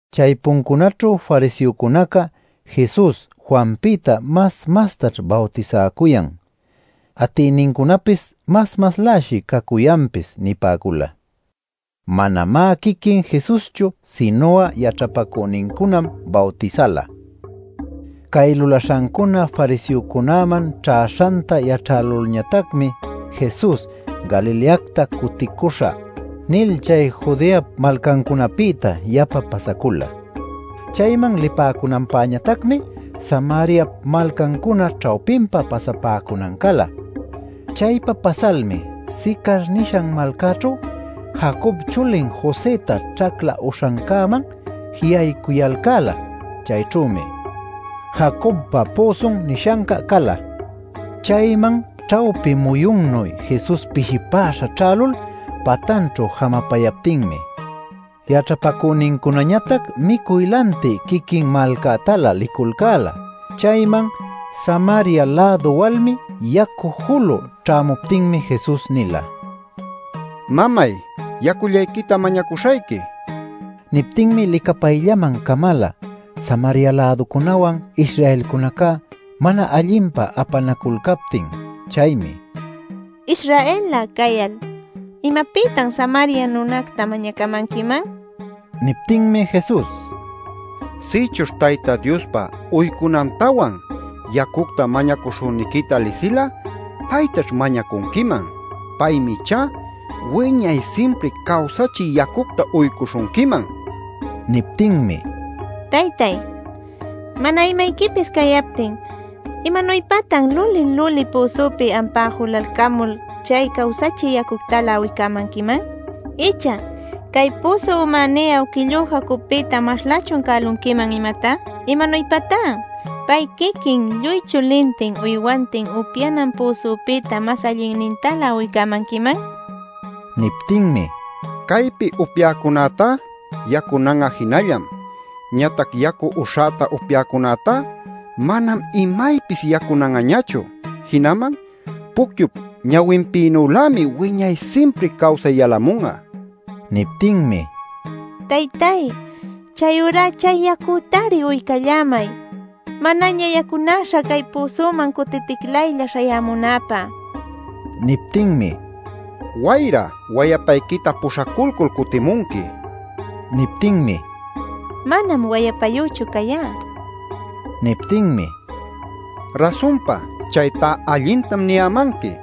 Chaypuncunaćhu fariseocunaca “Jesus Juanpïta mas mastash bawtisäcuyan. Atïnincunapis mas masläshi cacuyanpis” nipäcula. (Manamá quiquin Jesuschu, sinu'a yaćhapacünincunam bawtisala.) Cay lulaśhancuna fariseocunäman ćhäśhanta yaćhälulñatacmi Jesus “Galileacta cuticuśhä” nil chay Judeap malcancunapïta yapa pasacula. Chayman lipäcunanpäñatacmi, Samariap malcancuna ćhawpinpa pasapäcunan cala. Chaypa pasalmi Sicar nishan malcaćhu Jacob chulin Josëta ćhacla uśhancäman ji'aycuyalcäla. Chayćhümi “Jacobpa püsun” nishanca cala. Chayman ćhawpi muyunnuy Jesus pishipäśha ćhälul patanćhu jamapayaptinmi yaćhapacünincunañatac micuy lantï quiquin malcätalä liculcäla. Chayman Samaria-lädu walmi yacu julü ćhämuptinmi Jesus nila: “Mamay, yacullayquita mañacuśhayqui” nil. Niptinmi licapayllaman camala Samaria-läducunäwan Israelcunaca mana allinpa apanaculcaptin. Chaymi: “Israel-lä cayal ¿imapïtam Samaria nunacta mañacamanquiman?” nin. Niptinmi Jesus: “Sïchuśh Tayta Diospa uycunantawan, yacucta mañacuśhüniquita lisil'a, paytaćh mañacunquiman. Paymi ichá wiñay simpri cawsachï yacucta uycuśhunquiman” nin. Niptinmi: “Taytay, mana imayquipis cayaptin ¿imanuypatan luli-luli püsupi ampá julalcamul chay cawsachï yacuctalä uycämanquiman? Icha ¿cay püsu umäní awquillú Jacobpïta maslächun cälunquiman imatá? ¿Imanuypatá pay quiquin, lluy chulintin uywantin, upyanan püsupïta mas allinnintalä uycämanquiman?” nin. Niptinmi: “Caypi upyäcunätá yacunan'a jinallam. Ñatac yacu uśhäta upyäcunätá, manam imaypis yacunan'añachu. Jinaman pucyup ñawinpïnülämi wiñay simpri cawsay yalamun'a” nin. Niptinmi: “Taytay, chayurá chay yacütari uycallämay manaña yacunäśha cay püsuman cutiticlaylla śhayämunäpä” nin. Niptinmi: “Wayra wayapayquita puśhaculcul cutimunqui” nin. Niptinmi: “Manam wayapäyüchu cayá” nin. Niptinmi: “Rasunpa chaytá allintam niyämanqui.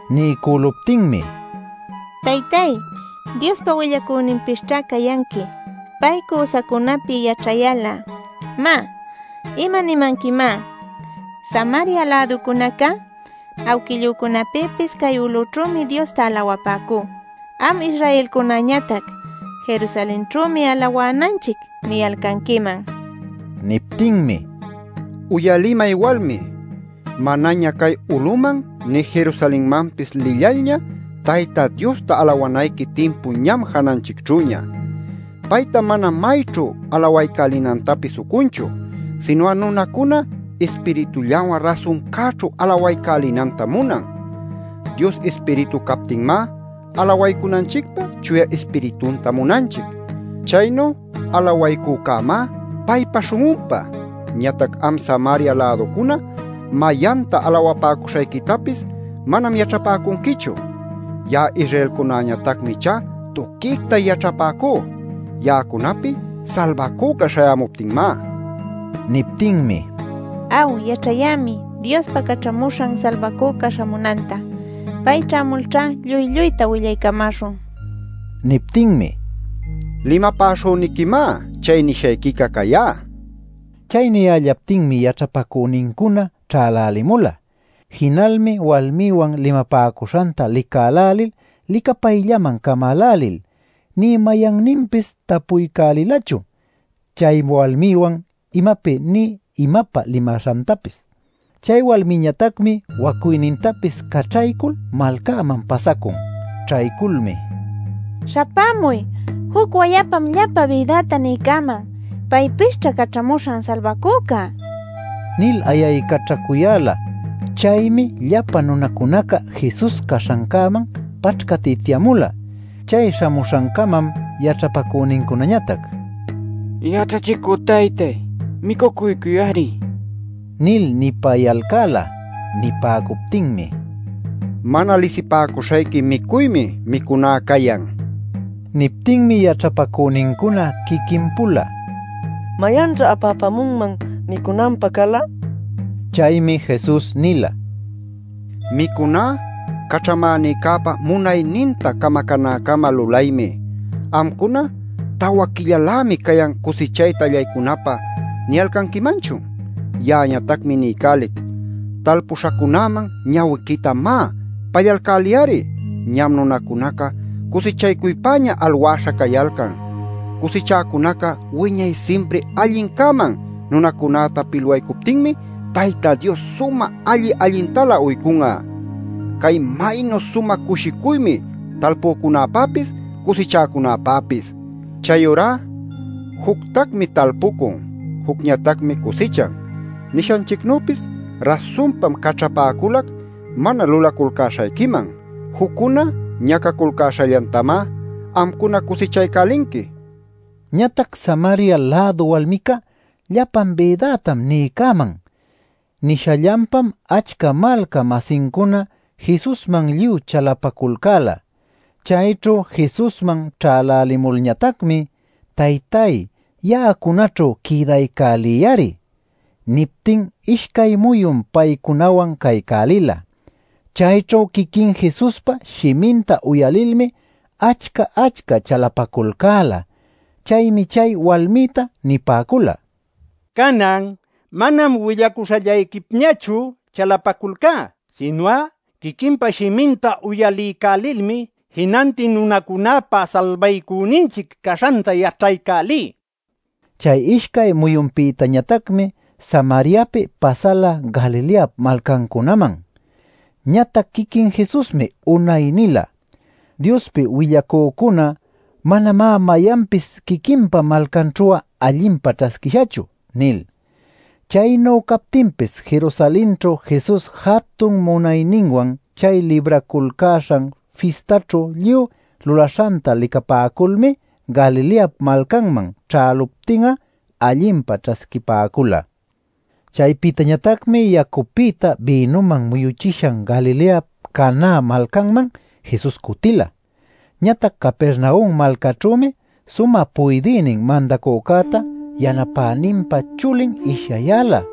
Niycüluptinmi: “Taytay, Diospa willacüninpisćha cayanqui. Pay cüsacunapi yaćhayal'a, má, ¿imanimanquimá? Samaria-läducunacá awquillücunapïpis cay ulućhümi Diosta alawapäcú. Am Israelcunäñatac ‘Jerusalenćhümi alawänanchic’ niyalcanquiman” nin. Niptinmi: “Uyalimay walmi, manaña cay uluman nï Jerusalenmanpis lillalña, Tayta Diosta alawanayqui timpu ñam jananchicćhüña. Payta manam mayćhu alawaycälinantapis ucunchu, sinu'a nunacuna Ispiritullawan rasuncäćhu alawaycälinantam munan. Dios Ispiritu captinmá alawaycunanchicpä Chuya Ispiritunta munanchic. Chaynu alawaycücämá paypa śhun'unpä. Ñatac am Samaria-läducuna mayanta alawapäcuśhayquitapis manam yaćhapäcunquichu. Ya'a Israelcunañatacmi ichá tuquicta yaćhapäcú, ya'acunapi Salbacüca śhayämuptinmá” nin. Niptinmi: “Aw yaćhayämi Diospa Caćhamuśhan Salbacüca śhamunanta. Pay ćhämulćha lluy lluyta willaycamäśhun” nin. Niptinmi: “Limapäśhüniquimá, chay nishayquica cayá” nin. Chay niyällaptinmi yaćhapacünincuna ćhälälimula. Jinalmi walmiwan limapäcuśhanta licälälil licapayllaman camälälil nï mayanninpis tapuycälilachu chay walmiwan imapi, nï imapä limaśhantapis. Chay walmiñatacmi wacuynintapis caćhaycul malcäman pasacun. Ćhayculmi: “¡Śhapämuy! ¡Juc wayapam llapa bïdäta niycäman! ¿Paypisćha Caćhamuśhan Salbacüca?” nil ayaycaćhacuyäla. Chaymi llapa nunacunaca Jesus caśhancäman paćhcatityämula. Chay śhamuśhancamam yaćhapacünincunañatac: “Yaćhachicü taytay, micucuycuy-ari” nil nipayalcäla. Nipäcuptinmi: “Mana lisipäcuśhayqui micuymi micuná cayan” nin. Niptinmi yaćhapacünincuna quiquin-pula: “¿Mayanćha apäpamunman micunanpä cala?” ninaculcäla. Chaymi Jesus nila: “Micuná Caćhamänïcäpa munayninta camacänäcama lulaymi. ¿Amcuna ‘Tawa quillalämi cayan cusichayta allaycunapä’ niyalcanquimanchun? Ya'añatacmi niycälic: Talpuśhacunäman ñawiquita má pallalcäliy-ari. Ñam nunacunaca cusichaycuypäña alwäśha cayalcan. Cusichäcunaca wiñay simpri allincäman nunacunäta pilwaycuptinmi Tayta Dios sumä alli-allintalä uycun'a. ¡Cay maynu sumä cushicuymi talpücunäpapis, cusichäcunäpapis! Chayurá ‘Juctacmi talpucun; jucñatacmi cusichan’ nishanchicnüpis rasunpam caćhapäculac mana lulaculcäśhayquiman. Juccuna ñacaculcäśhallantamá amcuna cusichaycälinqui” nil. Ñatac Samaria-lädu walmica “Llapan bïdätam niycäman” nishallanpam achca malca-masincuna Jesusman lluy chalapaculcäla. Chayćhu Jesusman ćhälälimulñatacmi “Taytay ya'acunaćhu quïdaycäliyari” niptin ishcay muyun paycunawan caycälila. Chayćhu quiquin Jesuspa shiminta uyalilmi achca-achca chalapaculcäla. Chaymi chay walmïta nipäcula: “Canan manam willacuśhallayquipñachu chalapaculcá, sinu'a quiquinpa shiminta uyaliycälilmi jinantin nunacunäpa Salbaycüninchic caśhanta yaćhaycälí” nil. Chay ishcay muyunpïtañatacmi Samariapi pasala Galileap malcancunaman. (Ñatac quiquin Jesusmi unay nila: “Diospi willacücuná manamá mayanpis quiquinpa malcanćhu'a allinpa ćhasquishachu” nil.) Chaynu captinpis Jerusalenćhu Jesus jatun munayninwan chay Libraculcäśhan Fistaćhu lluy lulaśhanta licapäculmi Galileap malcanman ćhäluptin'a allinpa ćhasquipäcula. Chaypïtañatacmi yacupïta, bïnuman muyuchishan Galileap Caná malcanman Jesus cutila. Ñatac Capernaum malcäćhümi sumä puydïnin mandacücäta yanapäninpa chulin ishyayäla.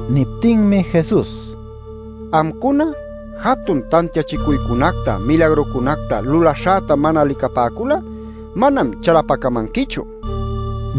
Niptinmi Jesus: “Amcuna jatun tantiachicuycunacta milagrucunacta lulaśhäta mana licapäcul'a manam chalapacamanquichu” nin.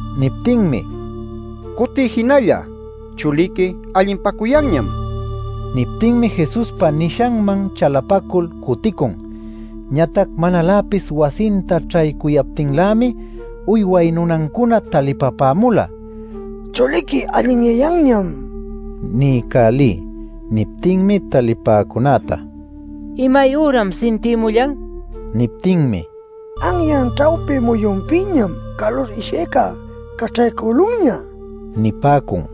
Niptinmi: “Cutiy jinalla. Chuliqui allinpacuyanñam” nin. Niptinmi Jesuspa nishanman chalapacul cuticun. Ñatac manaläpis wasinta ćhaycuyaptinlämi, uyway nunancuna talipapämula: “Chuliqui allinyayanñam” niycälï. Niptinmi talipäcunäta: “¿Imayüram sintïmullan?” nicuyan. Niptinmi: “Anyan ćhawpi muyunpïñam calur ishyayca caćhaycülunña” nipäcun.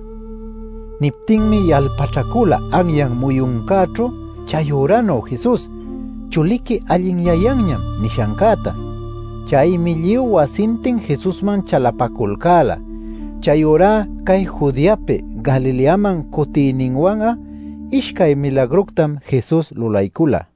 Niptinmi yalpaćhacüla anyan muyuncäćhu chayüranuy Jesus: “Chuliqui allinyayanñam” nishancäta. Chaymi lluy wasintin Jesusman chalapaculcäla. Chayurá cay Judeapi Galileaman cutiyninwan'a ishcay milagructam Jesus lulaycula.